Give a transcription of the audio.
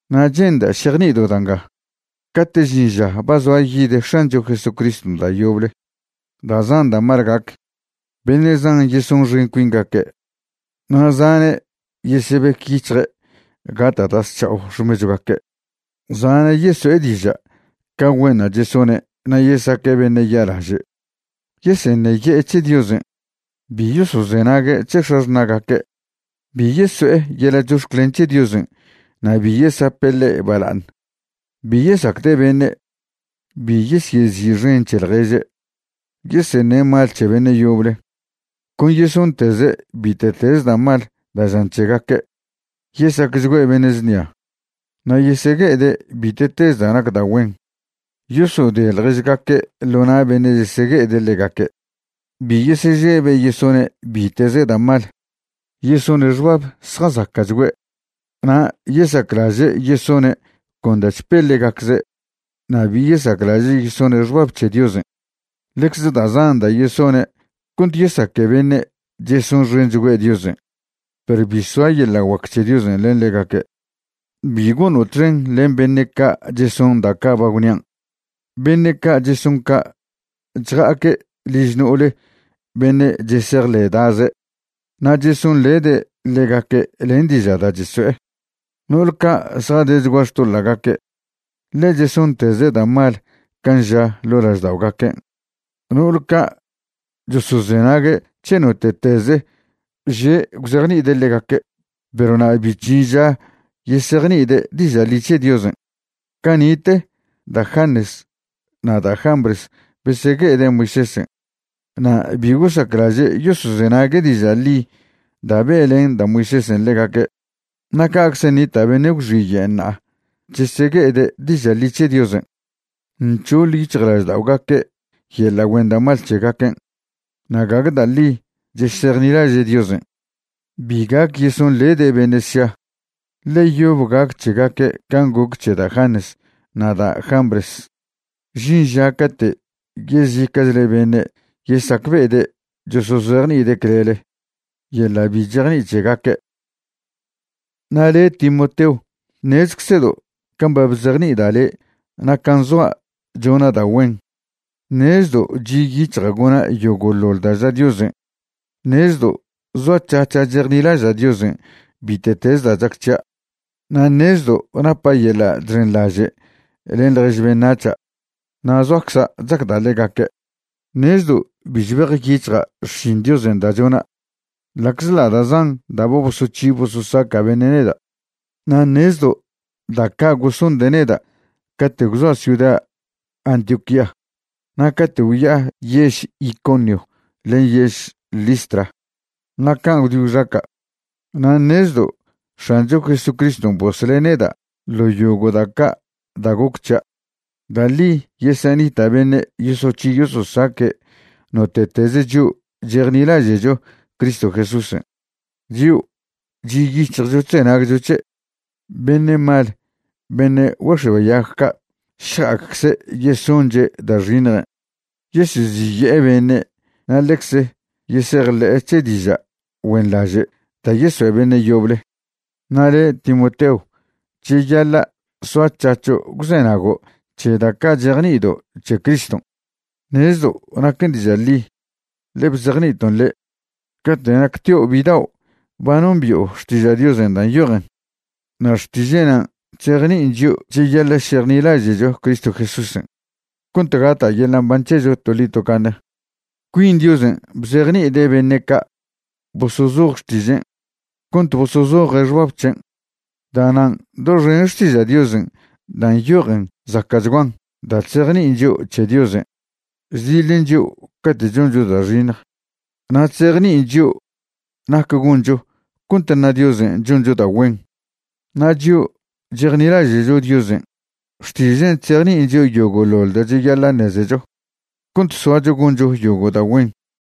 Na' che'nda' šejni'ido' da' nga, cate' žin ža ba zoa yid X̱ancho Jesucriston' da' yoble, da' zan da' mal gac. Beṉe' zan yesonxen cuingaque', na' zane' yesebec yic̱hje' gata' da' zc̱ha'o xmechwgaque'. Zane' yeso'e diža' ca güenṉa' chesone' na' yesaque' beṉe' ya'laže'. Yeseṉeye'e c̱he Diosen'. Bi yosozenague' c̱he x̱axṉa'gaque'. Bi yeso'e yeḻa' chox̱clen c̱he Diosen' na' bi yesape' ḻe' bala'aṉ. Bi yesacde' beṉe', bi yesyezi'xen c̱he ḻježe', yeseṉe' mal c̱he beṉe' yoble, con yesonteze' bite'teze da' mal da' žan c̱hegaque', yesacchgüe' beṉe' znia, na' yesegue'ede' bite'tez da' nac da' güen. Yosode ḻježgaque' ḻo na' beṉe' chesegue'ede' ḻegaque', bi yesežebe' yesone' bite'ze da' mal, yesone' xbab zjazaca'chgüe', na' yesaclaže' yesone' con da' chpe ḻegacze' na' bi yesaclaže' yesone' xbab c̱he Diosen'. Ḻecze da' zan da' yesone' cont yesaque beṉe' chesonxenchgüe' Diosen', perw bi soa yeḻa' guac c̱he Diosen' len ḻegaque'. Bi gono' txen len beṉe' ca' cheson da' ca' ba gwnian'. Beṉe' ca' cheson ca' chja'aque' liž no'ole beṉe' chesejḻe'daze', na' chesonḻede' ḻegaque' len diža' da' cheso'e. No'ol ca' zjadechgua xtoḻa'gaque', ḻe chesonteze' da' mal can' ža ḻo' lažda'ogaquen'. No'ol ca' chosozenague' c̱he note'teze' že' gwzejni'ide' ḻegaque', perw na' bi chžin ža yesejni'ide' diža' ḻi c̱he Diosen'. Cani'te da' Janes na' da' Jambres besegue'ede' Moisésen' na' bi gosaclaže' yosozenague' diža' ḻi da' be'len da' Moisésen' ḻegaque', na' ca'czen' nita' beṉe' gwxiye' ṉa'a chesegue'ede' diža' ḻi c̱he Diosen'. Nc̱hoḻ yic̱hjlažda'ogaque' yeḻa' güen da' mal c̱hegaquen', na' gague da' ḻi chesejnilaže' Diosen'. Bi gac yesonḻede' beṉe' sša, ḻe yob gac c̱hegaque' can' goc c̱he da' Janes na' da' Jambres, žin ža cate' yezica'chle beṉe' yesacbe'ede' chosozejni'ide' clele yeḻa' bi chejni'i c̱hegaque'. Na' le' Timoteo, ṉezeczedo' can' ba bzejni'ida' le' na' can' zoa' chona' da' güen. Ṉezdo' chi' yic̱hja' gona' yogo'ḻoḻ da' ža Diosen'. Ṉezdo' zoac̱hac̱ha' chejnilaža' Diosen' bite'tez da' chac c̱hia'. Na' ṉezdo' napa' yeḻa' chxenḻaže' len ḻjež beṉac̱ha' na' zoacza' chacda' ḻegaque'. Ṉezdo' bi chbejyic̱hja' xšin Diosen' da' chona', ḻa'czḻa' da' zan da' ba bosoc̱hi bososaca' beṉe' neda'. Na' ṉezdo' da' ca' gosonde' neda' cate' gwzoa' ciuda Antioquía na' cate' gwya'a yež Iconio len yež Listra, na' can' gwdi gwxaca'. Na' ṉezdo' X̱ancho Jesucriston' bosle' neda' ḻo yogo' da' ca' da' goc c̱hia'. Da' ḻi yesenita' beṉe' yosoc̱hi yososaque' note'tez chio' chejnilaže'cho Cristo Jesúsen', chio' chi' yic̱hjcho chzenagcho c̱he'. Beṉe' mal beṉe' güex̱oayag ca' šja'acze' yesonche' da' xiṉjen', yeseziye'e beṉe' na' ḻecze yesejḻe'e c̱he diža' güenḻaže' da' yesoe' beṉe' yoble. Na' le' Timoteo, cheyaḻa' soac̱hac̱ho' gwzenago' c̱he da' ca' chejni'ido' c̱he Criston'. Ṉezdo' naquen diža' ḻi, ḻe bzejni'iton' le'. Cate' nactio' bidao' ba nombi'o Xtiža' Diosen' da' nyojen. Na' Xtiže' nan' chzejni'in chio' cheyaḻa' šejnilaže'cho Cristo Jesúsen' cont gata' yeḻa' mban c̱hecho toḻi tocaṉe. Cuin Diosen' bzejni'ide' beṉe' ca' bosozoj Xtižen' cont bosozoje' xbab c̱hen'. Da'nan' doxen Xtiža' Diosen' dan' nyojen zaca'chguan da' chzejni'in chio' c̱he Diosen', chdiḻen chio' cate' choncho da' xiṉj, na' chzejni'in chio' nac goncho cont ṉa Diosen' choncho da' güen. Na' chio' chejnilaže'cho Diosen', Xtižen' chzejni'in chio' yogo'ḻoḻ da' cheyaḻa' ṉezecho cont soacho goncho yogo' da' güen.